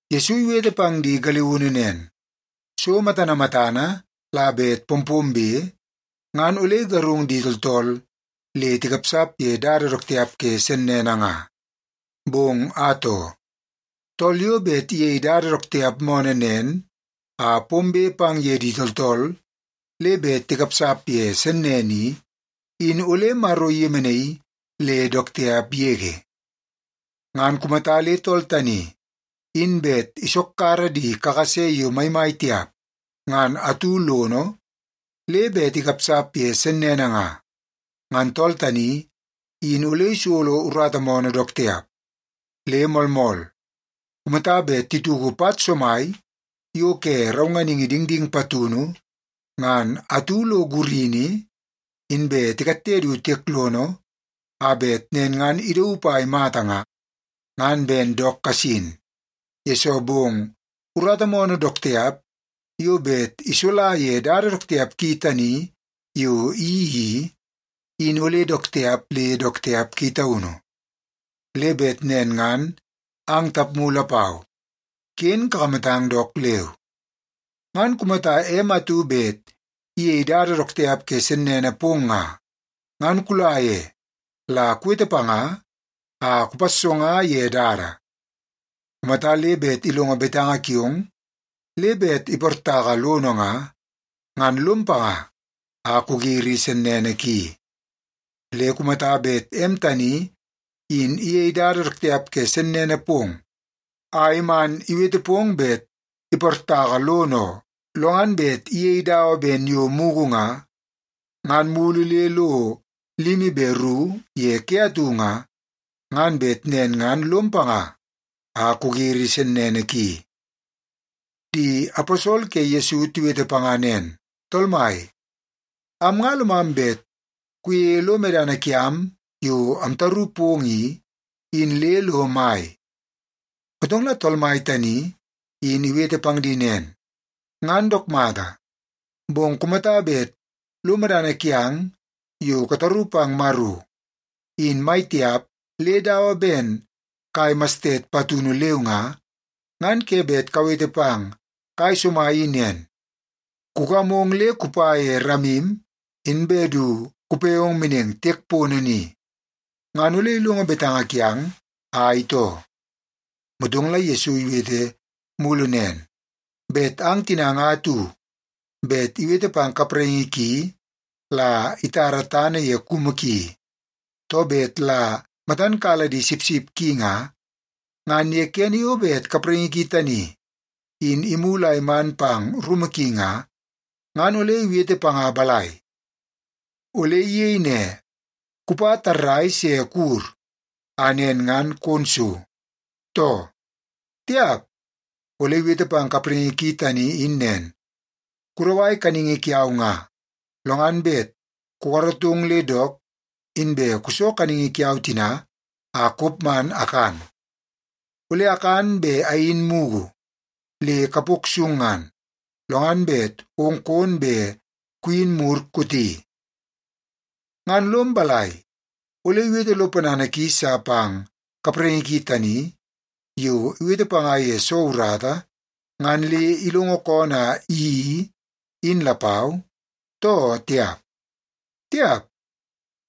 Yesu iwete pang di galiunu nen, “So matana matana la bet pompombe, ngan ole igarung di tooltool le tikapsap ye dada dook tiap ke sennene nga. Bong atoo, tool yo bet iyei dada dook tiap moonoo nen a pombe pang ye di tooltool le bet tikapsap ye sennene i, in ole Maro iyemenaii le dook tiap yege. Ngan kumata le tool tani in bet isokkara di kakase yo maimai tiap ngan atu lono, le bet ikapsap ye sennene nga, ngan tool tani in ole isolo urata moonoo dook tiap. Le moolmool, kumata bet tituku pat somai yo ke raunganingi dingding patunu ngan atu lo gurini, inbe tikatte du tiek lono a bet nen ngan idaup a imata nga, ngan ben dook kasin, yesoo bong urata moonoo dook tiap yo bet isola ye dada dook tiap ki tani yo iyeii i, in ole dook tiap le dook tiap ki taunu. Le bet nen ngan ang tapmu lapau, ken kakamatang dook leu. “Ngan kumata em atu bet iyei dada dook tiap ke sennene pong nga, ngan kula ye la kuwete panga a kupassonga ye dada. Kumata le bet ilongo betanga kiong le bet iportaka lono nga, ngan lom panga a kugiri sennene ki. Le kumata bet em tani in iyei dada dook tiap ke sennene pong a iman iwete pong bet iportaka lono oo, lo ngan bet iyei dawa ben yo mugu nga, ngan mulu le lo limi be ru ye ke atu nga, ngan bet nen ngan lom panga a kugiri sennene ki.” Di aposol ke Yesu tiwete panga nen, “Tool Mai, am nga lomam bet kuyeie lo medana kiam yo amtaru pong i, in le lo mai.” Motong la Tool Mai tani in iwete pang di nen, “Ngan dook mata, bong kumata bet lo medana kiang yo kataru pang Maro, in mai tiap le dawa ben kai mastet patunu leu nga, ngan ke bet kawete pang kai somai i nen, ‘Kugamong le kupa ye ramim, inbe du kupe ong meneng tiek pono ni,’ ngan ole ilongo betanga kiang a itoo.” Motong la Yesu iwete mulu nen, “Bet ang tina nga atu bet iwete pang kapraingi ki la itara tana ye kumu ki, too bet la matan kala di sipsip ki nga, ngan ye kene yo bet kapraingi ki tani in imulu a iman pang rumu ki nga, ngan ole iwete panga balai? Ole iyei ne, ‘Kupa tarrai se kuwur, a nen ngan kon so,’ too? Tiap! Ole iwete pang kapraingi ki tani in nen, ‘Kudawai kaningi kiau nga, lo ngan bet kukaratong le dook, inbe kuso kaningi kiau tina a kop man akan. Ole akan be ayin mugu le kapok sung ngan, lo ngan bet ong kon be kuyin mur kooti.’ Ngan lom balai, ole iwete lo ponana ki sa pang kapraingi ki tani yo iwete panga ye soo urata ngan le ilongo koonoo a iyeii, in lapau, too tiap? Tiap!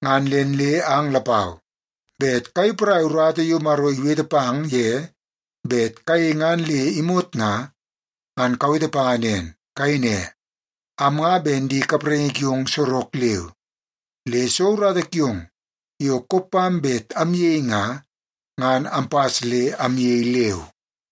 Ngan nen le ang lapau bet kayei porai urata yo Maro iwete pang ye bet kayei ngan le imot nga, ngan kawete panga nen. Kayei ne, ‘Am nga ben di kapraingi kiong sorok leu, le soo urata kiong yo kop pam bet amyei nga, ngan ampas le amyei leu.’”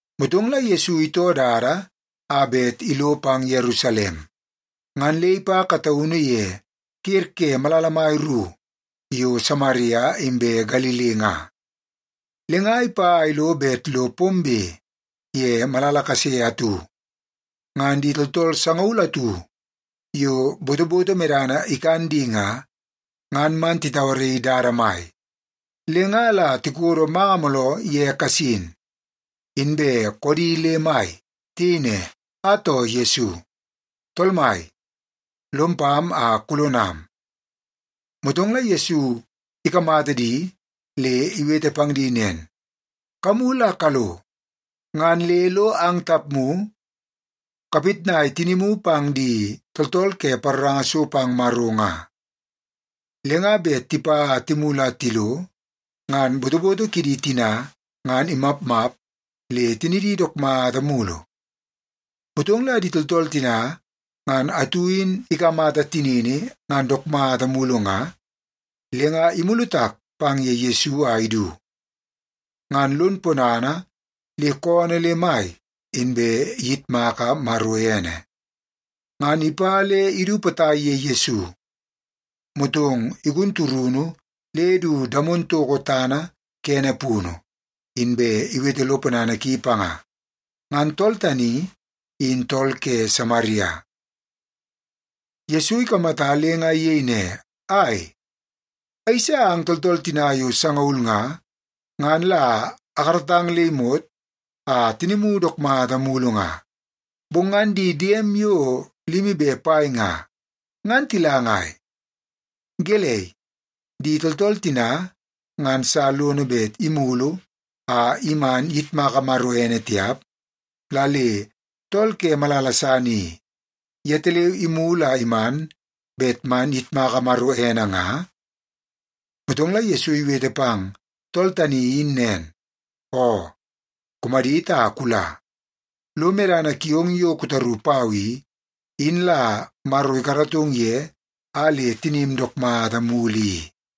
Motong la Yesu itoo dada a bet ilo pang Yerusalem. Ngan le ipa kataunu ye ker ke malala mai ru yo Samaria inbe Galili nga. Le nga ipa a ilo bet lo pombe ye malala kase atu, ngan di tooltool sangaul atu yo botoboto medana ikan di nga, ngan man titauaraii dada mai. Le nga la tikodo manga mooloo ye kasin, inbe koodi le mai. Tiyei ne, “Atoo, Yesu! Tool mai, lom pam a kulonam!” Motong la Yesu ikamata di le iwete pang di nen, “Kamulu a kalo, ngan le lo ang tapmu kapitnai tinimu pang di tooltool ke paroranga so pang Maro nga.” Le nga bet tipa a timulu a tilo, ngan botoboto kidi tina ngan imapmap le tinidi dook mata mulu. Motong la di tooltool tina ngan atu in ikamata tinini ngan dook mata mulu nga, le nga imulu tak pang ye Yesu a idu, ngan lon ponana le koonoo le mai, inbe iyitmaka Maro ene. Ngan ipa le idu potai ye Yesu, motong igun turunu le du damon toko tana kene punu, inbe iwete lo ponana ki panga. Ngan tool tani in tool ke Samaria. Yesu ikamata le nga iyei ne, “Ai, ayeisa ang tooltool tina yo sangaul nga, ngan la akaratang le imot a tinimu dook mata mulu nga. Bong ngan di diem yo limi be pai nga, ngan tila ngai? Gelei, di tooltool tina ngan sa lono bet imulu a iman iyitmaka Maro ene tiap, la le tool ke malala san i, yetaleu imulu a iman bet man iyitmaka Maro ene nga?” Motong la Yesu iwete pang tool tani in nen, “Oo, kumadit a kula. Lo medana kiong yo kutaru pau i, in la Maro ikaratong ye a le tinim dook mata mulu i.”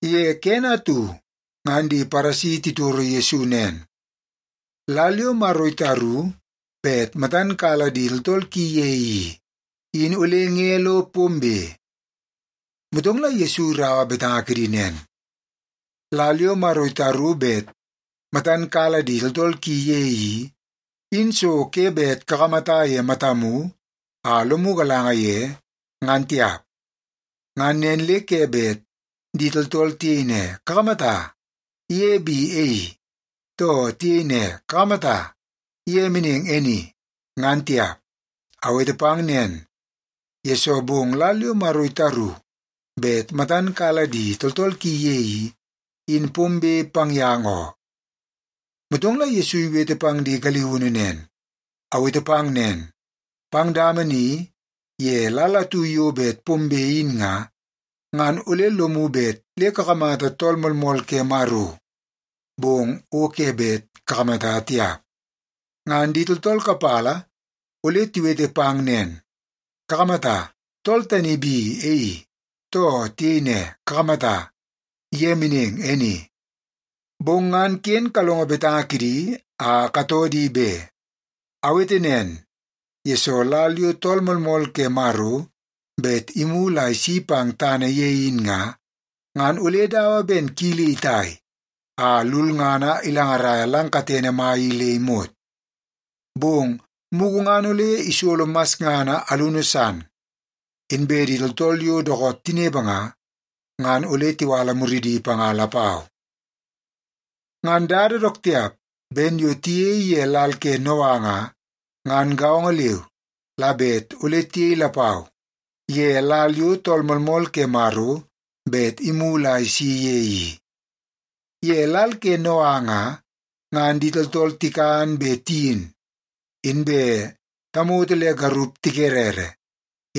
Ye kene atu ngan di Paresi titoro Yesu nen, “Lal yo Maro itaru bet matan kala di tooltool ki ye i, in ole nge lo pombe?” Motong la Yesu iraua betanga kidi nen, “Lal yo Maro itaru bet matan kala di tooltool ki ye i, in so ke bet kakamata ye matamu a lomu galanga ye, ngan tiap. Ngan nen le ke bet di tooltool tiyei ne, ‘Kakamata! Ye bi e i,’ too tiyei ne, ‘Kakamata! Ye meneng e ni,’ ngan tiap. Awete pang nen, yesoo bong lal yo Maro itaru bet matan kala di tooltool ki ye i, in pombe pang yang oo.” Motong la Yesu iwete pang di galiunu nen, “Awete pang nen, pang dama ni ye lal atu yo bet pombe in nga, ngan ole lomu bet le kakamata Tool Moolmool ke Maro, bong o ke bet kakamata tiap. Ngan di tooltool kapala ole tiwete pang nen, ‘Kakamata, tool tani bi e i,’ too tiyei ne, ‘Kakamata, ye meneng e ni.’ Bong ngan ken kalongo betanga kidi a katoo di be. Awete nen, yesoo lal yo Tool Moolmool ke Maro bet imulu a isi pang tana ye in nga, ngan ole dawa ben kili itai a lulngana ilangaraia lang katene mai i le imot. Bong mugu ngan ole isolo masngana alunu san, inbe di tooltool yo dookoot tinepe nga, ngan ole tiwala muridi panga lapau. “Ngan dada dook tiap ben yo tiyei ye lal ke Noa nga, ngan gaongo leu la bet ole tiyei lapau ye lal yo Tool Moolmool ke Maro bet imulu a isi ye i. Ye lal ke Noa nga, ngan di tooltool tikan be tiyin, inbe tamoto le garup tikerere,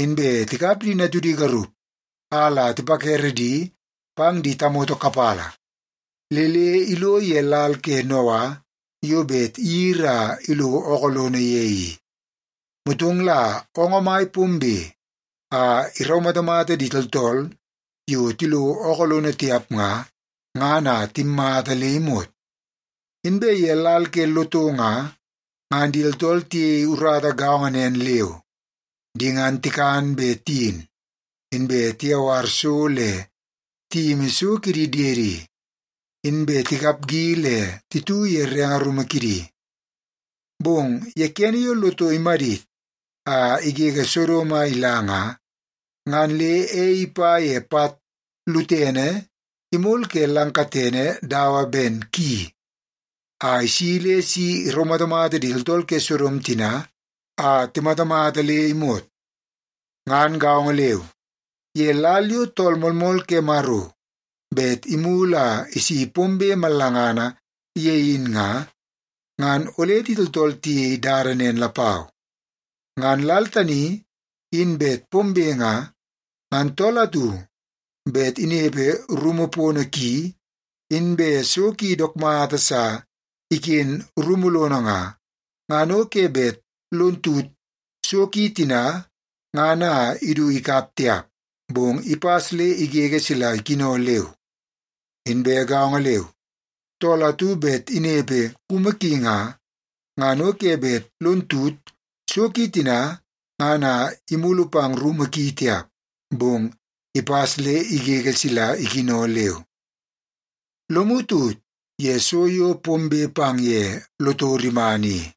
inbe tikap di natudi garup a la tipakere di pang di tamoto kapala, le le ilo ye lal ke Noa yo bet iyiri a ilo ookoo lono ye i. Motong la oongoo mai pombe a iraumatamata di tooltool yo tilo ookoo lono tiap nga, ngan a timmata le imot. “Inbe ye lal ke Loto nga, ngan di tooltool tiyei urata gaongo nen leu. Di ngan tikan be tiyin, inbe tiyawar so le tiyimi so kidi diedi, inbe tikapgi le titu ye renge rumu kidi. Bong ye kene yo Loto imadit a igege Sodom a ila nga, ngan le ei ipa ye pat lutene imol ke lang katene dawa ben ki, a isi le si iraumatamata di tooltool ke Sodom tina a timatamata le imot. “Ngan gaongo leu, ye lal yo Tool Moolmool ke Maro bet imulu a isi pombe mallangana ye in nga, ngan ole di tooltool tiyei dada nen lapau. Ngan lal tani in bet pombe nga, ngan tool atu bet inepe rumu pono ki, inbe so ki dook mata sa iken rumu lono nga, ngan o ke bet lon tut so ki tina ngan a idu ikap tiap, bong ipas le igege sila ikino leu. Inbe gaongo leu, tool atu bet inepe kumu ki nga, ngan o ke bet lon tut so ki tina ngan a imulu pang rumu ki tiap, bong ipas le igege sila ikino leu. Lomu tut ye so yo pombe pang ye Loto rimana i.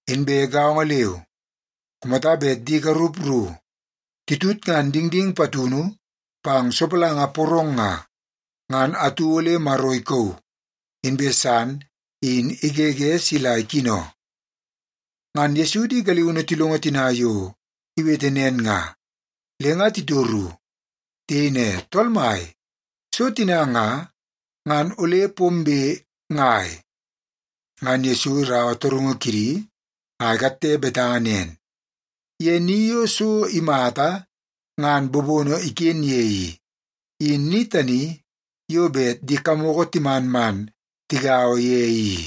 Inbe gaongo leu, kumata bet di garup ru titutngan dingding patunu pang sopalanga porong nga, ngan atu ole Maro ikauu, inbe san in igege sila ikino.” Ngan Yesu di galiunu tilongo tina yo iwete nen nga, le nga titoru. Tiyei ne, “Tool Mai, so tina nga, ngan ole pombe ngai?” Ngan Yesu iraua torungu kidi a ikatte betanga nen, “Ye ni yo so imata ngan bobono iken ye i, in ni tani yo bet di kamoko timan man tigaua ye i.”